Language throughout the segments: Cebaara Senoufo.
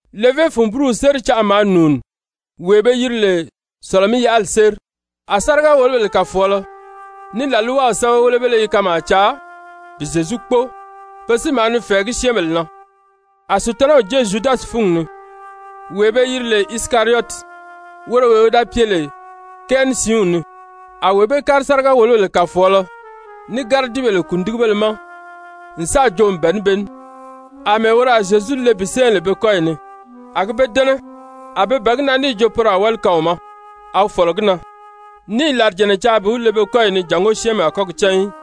Levé fun búruw séri canʔa maa nùuni, wee be yiri lè Sɔ̀lɔ-mí-yaʔali séri. A sáriga-wòlobèle kàfɔɔlɔ ní làlwaw sɛ́bɛwelebéle i kanmaa caa bi Zyezu kpóo. Pe si maa ni fɛ̀ɛgí syɛ́ɛnbèle na. A Sutanaw jée Zyudasi fúngi ni, wee be yiri lè Isikariyɔti, woro wee wi da pye lè kɛɛ ní siinw ni. A wee bee kári sáriga-wòlobèle kàfɔɔlɔ ní gáridibèle kùndigibéle ma n sáà joo n bɛ̀ɛ ní be ní àmɛɛ woro a Zyezu le bi sɛ́ɛ lè be kɔ́yi ni. A gi be dɛ́nɛ, a be bɛ̀ɛ gi na níì jo poro a wáli kaan wi ma. A wi fɔ̀lɔ gi na, ní i làrijànna caa bi wi le be kɔ́yi ni jàngó syɛ́ɛnmi a kɔ́ gi cán í.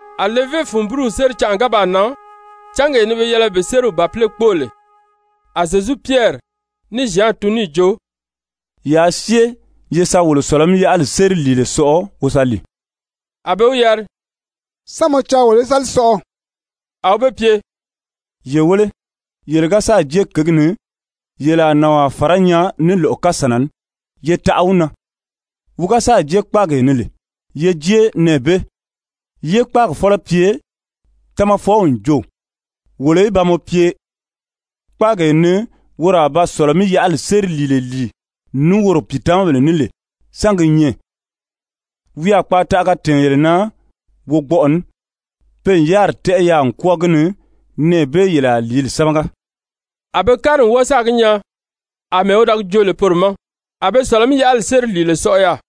A levé fun búruw séri canʔa ga baa nan, cángee ni be yɛlɛ bi sériw bàpile kpóo lè, a Zyezu Pyɛri ní Zyan tun níì jo: «Yaa syée ye sa wolo Sɔ̀lɔ-mí-yaʔali séri lìile sɔʔɔ wo sa lìi.» A be wi yari: «Sán mɔ caa wolo í sa li sɔʔɔ?» A wi be pye: «Ye wéle, yele ga sáà jée kěgi ni, yele a nànwaa fàrá nyaa ní lɔ̀ʔɔ kasànna ní. Ye taʔa wi na, wi ga sáà jée kpáagee ni lè, ye jée nɛɛ bee, yé kpáagi fɔ́lɔ pye: ‹Tamafɔw n jo wolo í ba mɔ pye, kpáagee ni woro a ba Sɔ̀lɔ-mí-yaʔali séri lìile lìi ní woro pìitamabèle ní lè, sán gi nyɛ?› Wi a kpaataʔaga tɛ̀ɛn yele na wogbɔʔɔ ní, pe n yáriri tɛ́ʔɛ yaà n kwɔ́ɔ gi ni, nɛɛ bee yele a lìíli sámaga.» A be kári n wɔ́ɔ sáà gi nyaa àmɛɛ wi da gi joo lè poro ma, a be Sɔ̀lɔ-mí-yaʔali séri lìile sɔʔɔ yaà.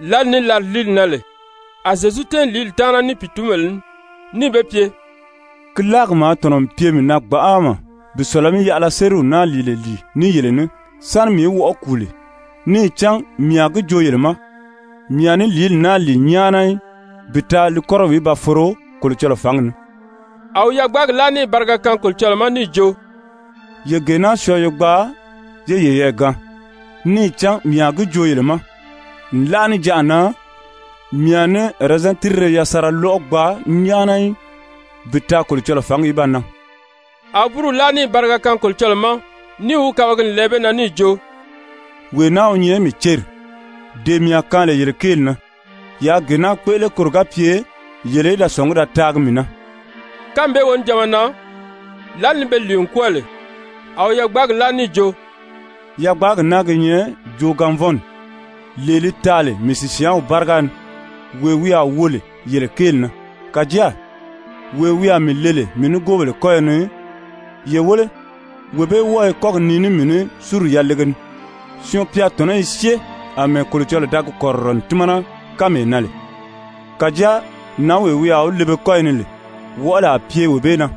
Lǎli ni làriliili nan lè, a Zyezu tɛ́ɛn lìíli taana ní pìitunbèle ní níì be pye: «Ki láagi maa tɔ̀nɔ n pye mii na gbanʔama bi Sɔ̀lɔ-mí-yaʔala sériw naa lìile lìi ní yele ní sáni mii í wɔʔɔ kùu lè, níì cán mii a gi joo yele ma, mii a ní lìíli naa lìi nyáana í bi taa li kɔ́rɔw í ba foro Kolocɔlɔɔ fǎngi ni.» A wi yagbaagi láa níì bariga kaan Kolocɔlɔɔ ma níì jo: «Ye gee naa syɔɔ ye gbaa yé yeyɛɛ gaan. Níì cán mii a gi joo yele ma, nlaʔa níjanʔa na mii a ní ɛrɛzɛn tírire yasanra lɔ́ʔɔ gbaa nyáana í bi taa Kolocɔlɔɔ fǎngi í ba nan.» A wi búruw láa níì bariga kaan Kolocɔlɔɔ ma níì wi kabagi n lɛɛ be na níì jo: «Wee naa wi nyɛ mii céri, [dee mii a kaan lè yele kéeli na. Yaa gee naa kpéʔele koro ga pye yele í da sɔ̀ngí da taagi mii na.» Kánmi bee wonijanma na, lǎli ni be lìi n kwɔ́ɔ lè, a wi yagbaagi láa níì jo: «Yagbaagi naa gi nyɛ joogaanvɔnni, lee li taa lè mii sìsyaanw báriga ni, wee wi a wo lè yele kéeli na.] Kàjáa wee wi a mii le lè mii nigoobèle kɔ́yɔ ni, ye wéle, wee bee wɔ́ɔ i kɔ́gi nii ní mii ní súri yalege ni. Syɔɔn-pya tɔ̀nɔ́ i syée àmɛɛ Kolocɔlɔɔ da gi kɔ̀rirɔ n tímana kánmee na lè. Kàjáa nǎnwee wi a wi le be kɔ́yi ni lè, wɔʔɔli a pye wee bee na.»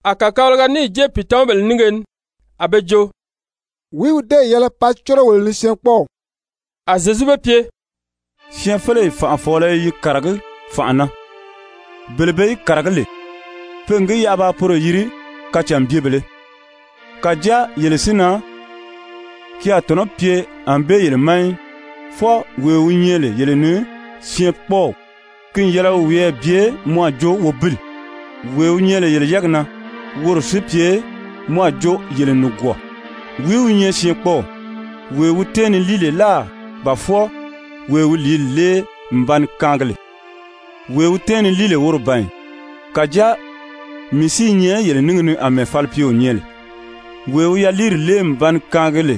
A kàkabalaga níì jée pìitamabèle nínge ni a be jo: «Wìí wi déè yɛlɛ paa córo wolo ni syɛɛnkpɔɔw?» A Zyezu be pye: «Syɛɛnfeleyi fànʔafɔɔlɔ i yi kàragí fànʔa na, bele be yi kàragí lè, pe n gi yaʔa yaa poro yiri kacànbyebèlē. Kàjáa yele si na ki a tɔ̀nɔ́ pye ànbée yele ma í. Fwɔɔ wee wi nyɛ lè yele ni syɛɛnkpɔɔw ki n yɛlɛ wi wiyɛɛ bye mɔ a jo wobili, wee wi nyɛ lè yele yɛ́ɛgi na, woro si pye mɔ a jo yele nìgwɔɔ. Wìí wi nyɛ syɛɛnkpɔɔw, wee wi tɛ́ɛn ni líi lè láà ba fwɔɔ wee wi lìíli lée n ba ni kaangi lè? Wee wi tɛ́ɛn ni líi lè, woro ban ì? Kàjáa mii si i nyɛ yele níngi ni àmɛɛ falipyeo nyɛ lè, wee wi yaliiri lée n ba ni kaangi lè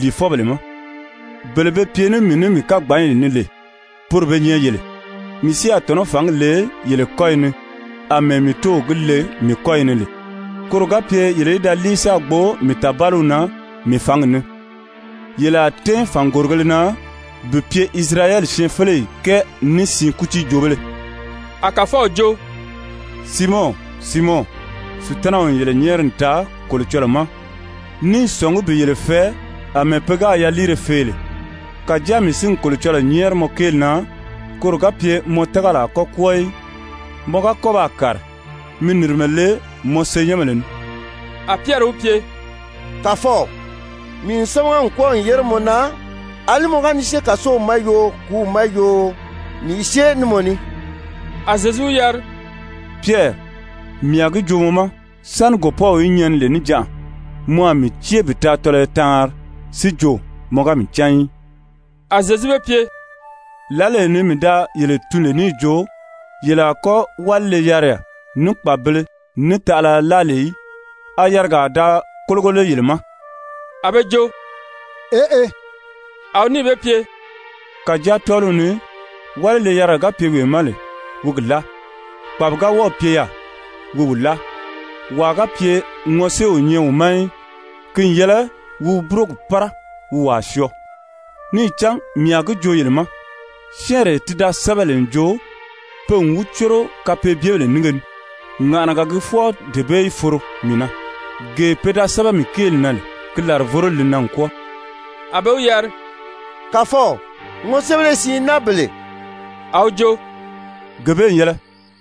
lìifɔbèle ma. Bele be pye ní mii ní mii kagbanyi ni lè, poro be nyɛ yele. Mii si a tɔ̀nɔ́ fǎngi le yele kɔ́yi ni àmɛɛ mii Tóow gi le mii kɔ́yi ni lè. Koro ga pye yele í da líi sáā gbo mii tàbaliw na mii fǎngi ni. Yele a tɛ́ɛn fàngorigēle na bi pye Isirayɛli syɛɛnfeleyi kɛɛ ní siin kútiijoobéle.» A Kàfɔw jo: «Siimɔn, Siimɔn, Sutanaw n yele nyɛ́ɛri n taa Kolocɔlɔɔ ma ní i sɔ̀ngí bi yele fɛɛ àmɛɛ pe gáā yaliire fee lè. Kàjáa mii si n Kolocɔlɔɔ nyɛ́ɛri mɔ kéeli na, koro ga pye mɔ tágali a kɔ́ kwɔ́ɔ í, mɔ ga kɔ́ baa kàri, mi nìrimɛ le mɔ senyɛnbèle ni.» A Pyɛri wi pye: «Kàfɔw, mii n sámaga n kwɔ́ɔ n yére mɔ na, àlí mɔ ga ni syée kàsow ma yoo, kùúw ma yoo, mii i syée ní mɔ ní.» A Zyezu wi yari: «Pyɛri, mii a gi joo mɔ ma, sáni gòpɔ́w í nyɛni lè níjanʔa, mɔ a mii cée bi taa tɔlɔyɔ taanri, si jo mɔ ga mii cán í.» A Zyezu be pye: «Lǎlee ni mii da yele tun lè níì jo yele a kɔ́ wálile-yariya, ní kpàbibēle, ní taʔalaya láa lè í, a yarigaa da kólogo lé yele ma?» A be jo: «Eʔe.» A wi níì be pye: «Kàjáa tɔ́ɔliw ni wálile-yariga ga pye wee ma lè, wi gi láa, kpàbi ga wɔ́ɔ̀ pye yaà, wi wi láa, wàa ga pye ŋɔsée o nyɛ wi ma í, ki n yɛlɛ wi wi búrogi pára wi wàa syɔɔ. Níì cán mii a gi joo yele ma, syɛ́ɛnree ti da sɛ́bɛ lè n jo: ‹Pe n wi córo kapeebyebèle nínge ni,› ŋàʔanaga gii fwɔɔ dee bee si foro mii na. Gee pe da sɛ́bɛ mii kéeli na lè, ki làrivoroli li nan n kwɔ́ɔ.» A be wi yari: «Kàfɔw, ŋɔséebéle siin i naa bele.» A wi jo: «Gee bee n yɛlɛ.»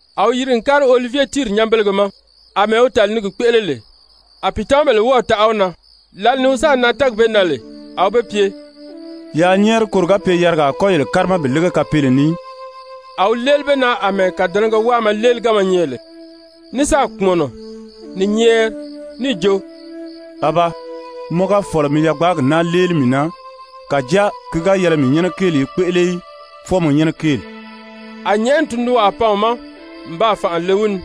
A wi yiri n kári Olivye tíiri nyanbelege ma, àmɛɛ wi tàli ni gi kpéʔele lè. A pìitamabèle wɔ́ɔ̀ taʔa wi na. Lǎli ni wi sáà nan tɛ́ɛgi bee na lè, a wi be pye: «Yaa nyɛ́ɛri koro ga pye yarigaa a kɔ́ yele kárima bi lége kapeele ni í.» A wi léeli be na àmɛɛ kàdɛnɛgɛ wáama léeliganma nyɛ lè, ní sáà kpùmɔnɔ ni nyɛ́ɛri níì jo: «Abaa, mɔ ga fɔ̀lɔ, mi yagbaagi naa léeli mii na. Kàjáa ki ga yɛlɛ mii nyɛ́nɛ kéeli í kpéʔele í, fwɔɔ mɔ nyɛ́nɛ kéeli.» [A nyɛ̀ʔɛni tundunwaa pan wi ma n baa fànʔa le wi ni.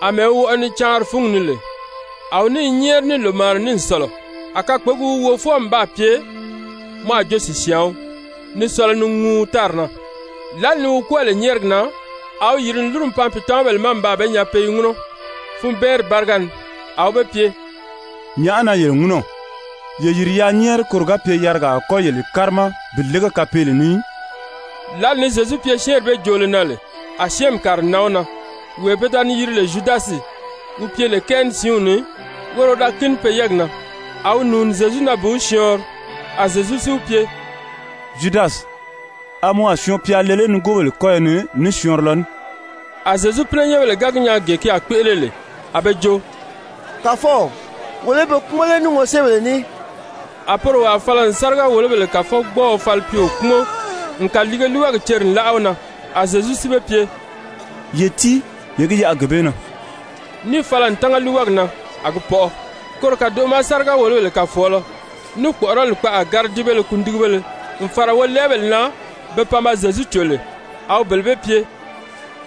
Amɛɛ wi wɔʔɔ ni caanri fúngi ni lè, a wi ní i nyɛ́ɛri ní lòmaana ní n sɔ̀lɔ, a kakpegi wi wo fwɔɔ n baa pye mɔ a jo sìsyaan wii, ni sɔlɔ ni ŋuu tári na.] Lǎli ni wi kwɔ́ɔ lè nyɛ́ɛrigi na, a wi yìri n lúru n pan pìitamabèle ma n baa be nyaa pe i ŋúnɔ funbɛɛnri báriga ni. A wi be pye: «Nyàʔá na yele ŋúnɔ? Ye yìri yaa nyɛ́ɛri koro ga pye yarigaa a kɔ́ yele kárima bi lége kapeele ni í.» Lǎli ni Zyezu pye syɛ́ɛnri bee joolo na lè, a syɛ́ɛnmi kàri n nan wi na, wee pe da ni yiri lè Zyudasi wi pye lè kɛɛ ní siinw ni, woro wi da kíni pe yɛ́ɛgi na. A wi nùuni Zyezu na bi wi syɔɔnri. A Zyezu si wi pye: «Zyudasi, a mɔ a Syɔɔn-pya le lé wi nigoobèle kɔ́yɔ ni ní syɔɔnrilɔ ní?» A Zyezu pínɛnyɛnbèle ga gi nyaa gee ki a kpéʔele lè, a be jo: «Kàfɔw, wolo í be kpúmɔn lé ní ŋɔséebèle ní?» A poro wàa fala n sáriga-wòlobèle kàfɔgbɔɔɔ falipyeo kpúmɔn n kàliige líiwagi ceri n láʔa wi na. A Zyezu si be pye: «Ye tíi, ye gi yaʔa gee bee na,» níì fala n tánga líiwagi na a gi pɔʔɔ. Koro kàdoʔo ma sáriga-wòlobèle kàfɔɔlɔ, ní kpɔ̀ʔɔrɔli kpaʔa gáridibéle kundigibéle n fàra wolɛɛbèle na be pan ba Zyezu cò lè, a wi bele bee pye: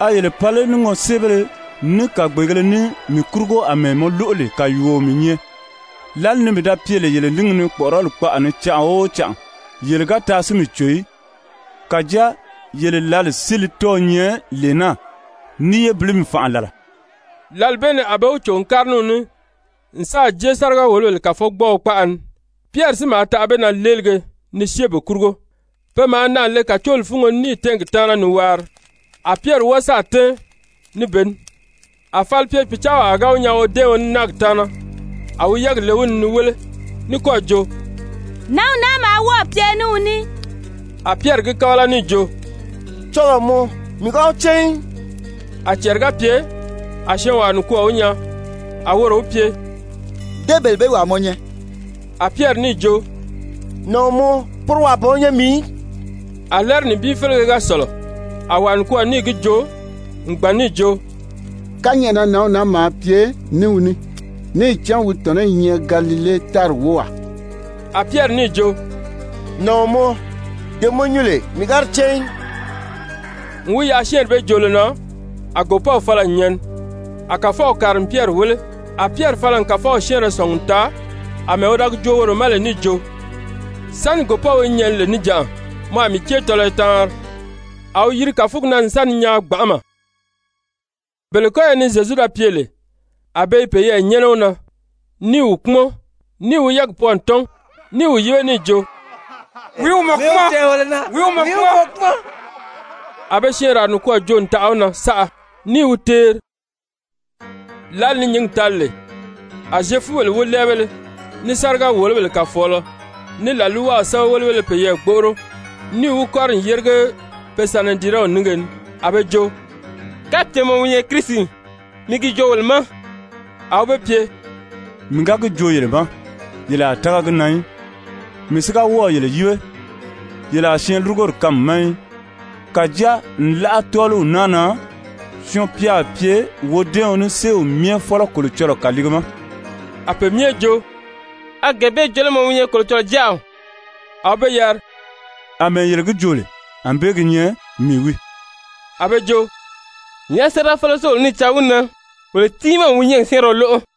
«A yele pan lé ní ŋɔséebéle, ní kàgbeegēle ní mii kurugo àmɛɛ mɔ lóʔo lè kàyuuo mii nyɛ? Lǎli ni mii da pye lè yele níngi ni kpɔ̀ʔɔrɔli kpaʔa ni canʔa o canʔa, yele ga taa si mii cò í. Kàjáa yele lǎli si li tɔ́ɔ̄ nyɛ lee naa ní yébilimi fànʔa làla.» Lǎli bee ni a be wi cò n kári ní wi ní n sáà jée sáriga-wòlobèle kàfɔgbɔɔɔ kpaʔa ni. Pyɛri si maa taʔa be na léelige ni syée be kurugo. Pe maa naà le kàcooli fúngo ni níì tɛ́ɛn gi taana ni waari. A Pyɛri wɔ́ɔ sáà tɛ́ɛn ní be ní. A falipye-pìcaawaa ga wi nyaa wodɛ́ɛɔn ní náagi taana, a wi yɛ́ɛgi le wi ni ni wéle, ní kɔ́ɔ̀ jo: «Nǎnw naa maa wɔ́ɔ̀ pye ní wi ní.» A Pyɛri gi kábala níì jo: «Cɔlɔɔ mɔ, mii ga wi cán í.» A cɛɛri ga pye, a syɔɔnwaa nikwɔɔ wi nyaa, a woro wi pye: «Dé bele bee wàa mɔ nyɛ.» A Pyɛri níì jo: «Nàɔn mɔ, poro wàa ban wi nyɛ mii í.» A lɛ́ɛri nibin félege ga sɔ̀lɔ, a wàa nikwɔɔ níì gi joo n gbàn níì jo: «Kányɛʔɛ na nǎnw naa maa pye ní wi ní, níì cán wi tɔ̀nɔ́ i nyɛ Galile tári wówaa.» A Pyɛri níì jo: «Nàɔn mɔ, dee mɔ nyuu lè, mii ga di cán í.» N wi yaʔa syɛ́ɛnri bee joolo na, a gòpɔ́w fala n nyɛni. A Kàfɔw kàri n Pyɛri wéle. A Pyɛri fala n Kàfɔw syɛ́ɛnrɛ sɔ̀ngi n taa àmɛɛ wi da gi joo woro ma lè níì jo: «Sáni gòpɔ́w í nyɛni lè níjanʔa, mɔ a mii cée tɔlɔyɔ taanri.» A wi yiri kàfugi na n sa ni nyaan gbanʔama. Bele kɔ́yɔ ni Zyezu da pye lè, a be i peyɛɛ nyɛ́nɛ wi na, ní i wi kpúmɔn, níì wi yɛ́ɛgi pwɔɔ n tɔ́n, ní i wi yíbe níì jo: «Wìí wi mɔ kpúmɔn? Mi wi tɛ̀ɛn wolo na.» A be syɛɛnraa nikwɔɔ joo n taʔa wi na saʔa, ní i wi teeri. Lǎli ni nyǐngi tali lè, a Zyefubèle wólɛɛbéle, ní sáriga-wòlobèle kàfɔɔlɔ, ní làlwaw sɛ́bɛwelebéle peyɛɛ gbóʔoro, níì wi kɔ́ri n yérige pe Sanedirɛnw nínge ni. A be jo: «Kapye mɔ wi nyɛ Kirisi, mi gi joo wolo ma.» A wi be pye: «Mii ga gi joo yele ma, yele a tága gi na í. Mii si ga wɔ́ɔ̀ yele yíbe, yele a syɛɛnlurugori kaan mii ma í. Kàjáa nlaʔa tɔ́ɔliw naa na Syɔɔn-pya a pye wodɛ́ɛɔn ní Séew Myɛ Fɔ́lɔ Kolocɔlɔɔ kàliige ma.» A pe myɛ jo: «A gee bee jo lé mɔ wi nyɛ Kolocɔlɔɔ Jáaw?» A wi be yari: «Amɛɛ yele gi joo lè, ànbée gi nyɛ, mii wii.» A be jo: «Nyàʔá séerafeleo si wolo ní i caa wi na? Wolo tiimaa n wi nyɔ́ɔgi syɛ́ɛnrɛ lóʔo.»